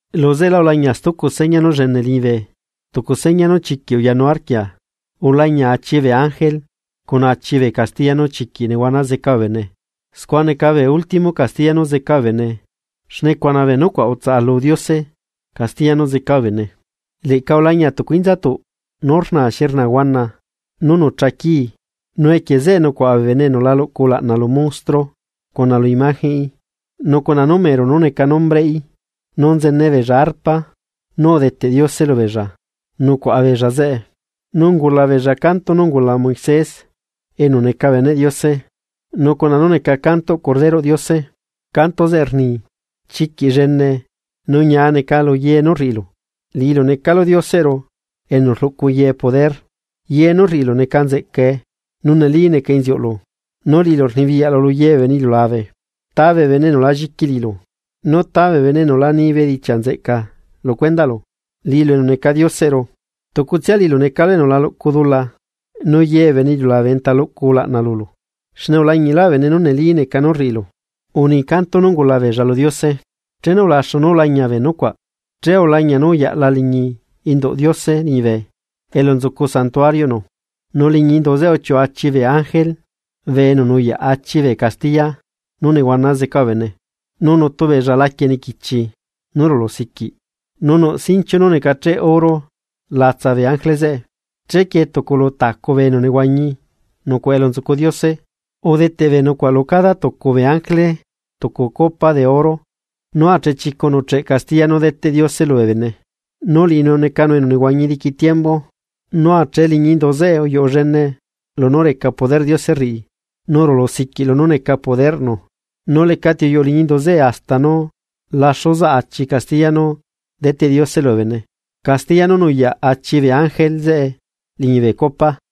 Luzeꞌelá ulañia stucu seña nú llene liñibe, tucu seña nú chiquiꞌ uyanu arquia: Ulañia achi bee ángele cuna achi bee castiya nú chiquiꞌ nehuana zeca bee bene, scua neca bee último castiya nú zeca bee bene xne cuna bee nucuaꞌ utsaꞌalu Diose castiya nú zeca bee bene. Leꞌca ulañia tucu inzatuꞌ nú rna xi rna huana, nú nucha quii. Nu equie zeꞌe nucuaꞌa bee bene enu la luꞌcu ulaꞌna lu monstruo, cuna lu imagenꞌí nu cuna numero nú neca nombreꞌí. Nu nzene beella arpa nú udeteꞌ Diose lubeella nucuaꞌa beella zeꞌe. Nu ungula beella canto nú ungula Moisés enu neca beneꞌ Diose nu cuna nú neca cantoꞌ Corderoꞌ Diose, canto zeꞌe rni: Chiquiꞌ llene nu ñia neca luye nú uriꞌilu, Liꞌilu necalu Dioseꞌru enu rluꞌcu ye poder. Ye nú rriꞌilu neca nzeꞌcae, nu neli neca inziuꞌlu, nu liꞌilu rnibiyaꞌlu luye bee bene iliulabe. ¿Ta bee bene enu la lliqui liꞌilu? ¿Nu ta bee bene enu la nii bedichiaꞌ nzeꞌca lucuendaꞌlu, liꞌilu enu neca Dioseꞌru? Tucutsia liꞌilu necalu enu la luꞌcu dula, nu ye bee bene iliulabe enta luꞌcu ulaꞌna lulu, xne ulañilaꞌ bee bene nú neli neca nú rriꞌilu. Uni canto nú ungula beella lu Diose. Chenu ulaxu nú ulañia bee nucuaꞌ, che ulañia nú uyaꞌla liñi induꞌ Diose liñibe elu nzucu santuario. Nu liñi indu zeꞌe uchiuꞌu achi bee ángele bee enu nuyaꞌ achi bee castiya nú nehuana zeca bee bene. Nu nutu beella laquie niquichi nú rulusiquiꞌ, nu nuꞌ sinchiu nú necacheꞌ oro latsa bee ángele zeꞌe. Chequie tucu lu tacu bee enu nehuañi nucuaꞌa elu nzucu Diose, udeteꞌ bee nucuaꞌ lu cada tucu bee ángele tucu copa de oro nú achechicu nuꞌcheꞌ castiya nú deteꞌ Diose lubee bene. Nu liꞌinu necanu enu nehuañi diqui tiembu. Nu ache liñi indu zeꞌe uyuꞌu llene lunú reca poderꞌ Diose rriꞌi, nu rulusiquiꞌ lunú neca poderꞌnu. Nu lecati uyuꞌu liñi indu zeꞌe hasta nú laxu zaꞌ achi castiya nú deteꞌ Diose lubee bene, castiya nú nuyaꞌ achi bee ángele zeꞌe liñi bee copa.